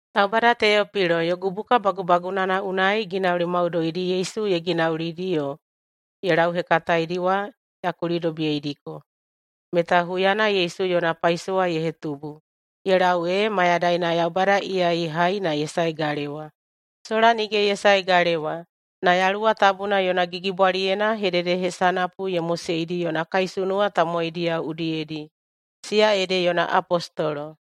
Taubada Teopilo, yogu buka bagubagunana unai ginauli maudoidi Yesu ye ginaulidi yo ye lauhekataedi wa ya kulidobiyeidiko, meta huyana Yesu yona paisowa ye hetubu ye lau ee mayadaina Yaubada iya ye hai na ye sae galewa. Sola nige ye sae galewa, na Yaluwa Tabuna yona gigibwaliyena hededehesanapu ye moseidi yona kaisunuwa tamowaidiyao udiyedi, siya ede yona apostolo.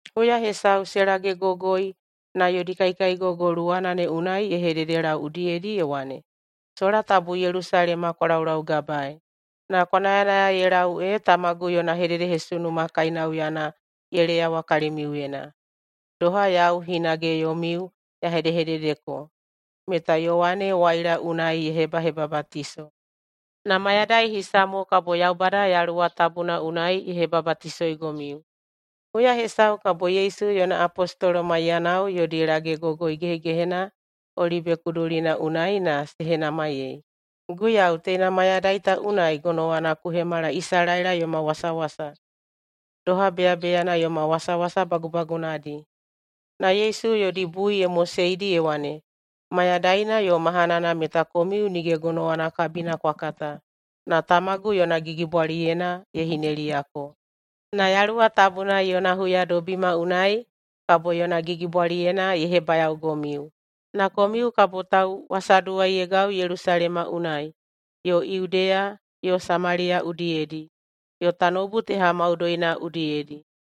Huya hesau se lagegogoi na yodi kaikaigogo luwana ne unai ye hededelau udiyedi ye wane, “Sola tabu Yelusalema kwa laulaugabaei, na kwa nayanaya ye lau ee tamagu yona hededehesunuma kainauyana ye leyawa kalimiuyena. Doha yau hinage yomiu ya hedehededeko, meta Yowane waila unai ye hebahebabatiso, na mayadai hisa mo kabo Yaubada Yaluwa Tabuna unai ye hebabatisoigomiu.” Huya hesau kabo Yesu yona apostolo maiyanao yodi lagegogoi gehegehena [Olibe kudulina unai] na se henamaiyei, “Guiyau, teina mayadai ta unai gonowana ku hemala Isalaela yoma wasawasa, doha beyabeyana yoma wasawasa bagubagunadi?” Na Yesu yodi bui ye moseidi ye wane, “Mayadaina yo mahanana meta komiu nige gonowana kabina kwa kata, na tamagu yona gigibwaliyena ye hineliyako. Na Yaluwa Tabuna yona huyadobima unai kabo yona gigibwaliyena ye hebayaogomiu. Na komiu kabo tauwasaduwaiyeigau Yelusalema unai, yo Yudeya yo Samaliya udiyedi, yo tanoubu teha maudoina udiyedi.”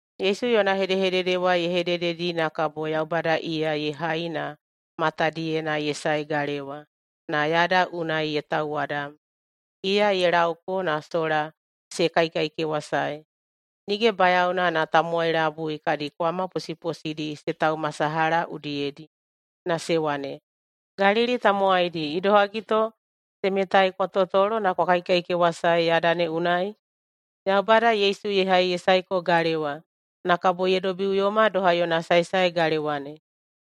Yesu yona hedehedede wa ye hedededi na kabo Yaubada iya ye hai na matadiyena ye sae galewa na yada unai ye tauwadam. Iya ye laoko na sola se kaikaikewasae. Nige bayaona na tamowai labui kadi kwama posiposidi se taumasalaha udiyedi na se wane, “Galili tamowaidi, idohagi to temetai kwa totolo na kwa kaikaikewasae yada ne unai? Yaubada Yesu ye hai ye saeko galewa, na kabo ye dobiꞌuyoma doha yona saesae galewa ne.”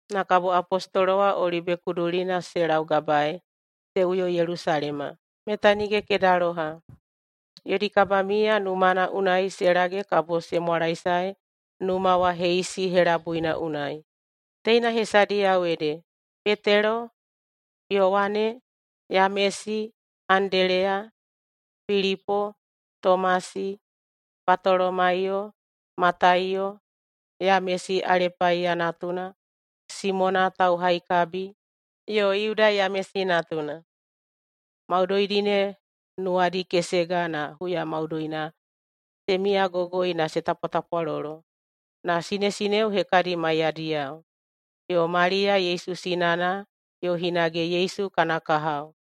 Na kabo apostolo wa Olibe kudulina se laugabaei se uyo Yelusalema, meta nige kedaloha. Yodi kabamiya numana unai se lage kabo se mwalaesae numa wa heisi helabuina unai. Teina hesadiyao ede: Petelo, Yowane, Yamesi, Andeleya, Pilipo, Tomasi, Batolomaiyo, Mataiyo, Yamesi Alepaiya natuna, Simona Tauhaikabi yo Yuda Yamesi natuna. Maudoidi ne nuwadi kesega na huya maudoina se miyagogoi na se tapwatapwalolo, na sinesineo hekadi maiyadiyao, yo Maliya Yesu sinana, yo hinage Yesu kana kahao.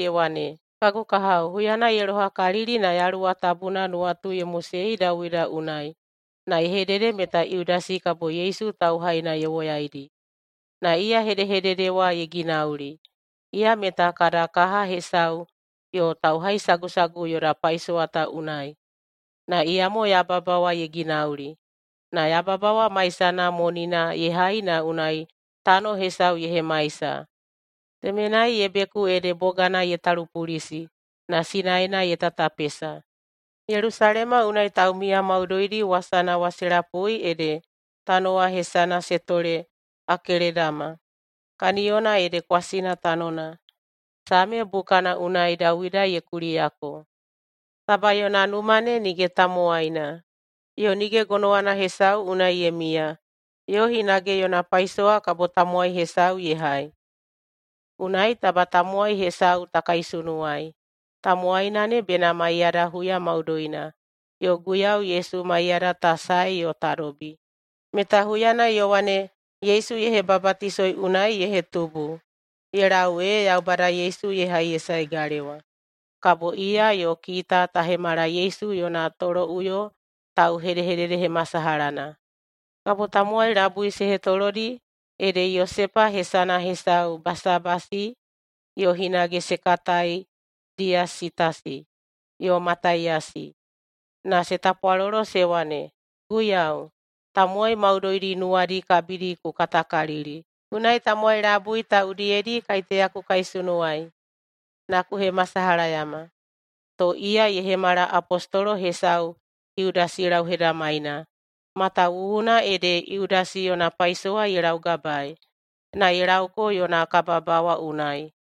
ye wane, “Kagu kahao, huyana ye lohakalili na Yaluwa Tabuna nuwatu ye mosei Dawida unai na ye hedede meta Yudasi kabo Yesu tauhaina ye woyaidi. Na iya hedehedede wa ye ginauli. Iya meta kada kaha hesau yo tauhaisagusagu yoda paisowa ta unai. Na iyamo yababa wa ye ginauli. Na yababa wa maisana monina ye hai na unai tano hesau ye hemaisa. Temenai ye beku ede bogana ye talupulisi na sinaena ye tatapesa. Yelusalema unai taumiya maudoidi wasana wa se lapui ede tano wa hesana se tole Akeledama, kaniyona ede ‘kwasina tanona’. Same bukana unai Dawida ye kuliyako, ‘Taba yona numa ne nige tamowaina, yo nige gonowana hesau unai ye miya,’ yo hinage, ‘Yona paisowa kabo tamowai hesau ye hai.’ Unai taba tamowai hesau ta kaisunuwai. Tamowaina ne bena maiyada huya maudoina, yo Guiyau Yesu maiyada ta sae yo ta dobi, meta huyana Yowane Yesu ye hebabatisoi unai ye hetubu, ye lau ee Yaubada Yesu ye hai ye sae galewa. Kabo iya yo kita ta hemala Yesu yona toloꞌuyo tauhededehemasalahana.” Kabo tamowai labui se hetolodi ede Yosepa hesana hesau Basabasi (yo hinage se katai Diyasitasi), yo Mataiyasi, na se tapwalolo se wane, “Guiyau, tamowai maudoidi nuwadi kabidi ku katakalili. Unai tamowai labui ta udiyedi kaiteya ku kaisunuwai na ku hemasalahayama. To iya ye hemala apostolo hesau Yudasi lauhedamaina, matawuwuna ede Yudasi yona paisowa ye laugabaei, na ye lauko yona kababawa unai.”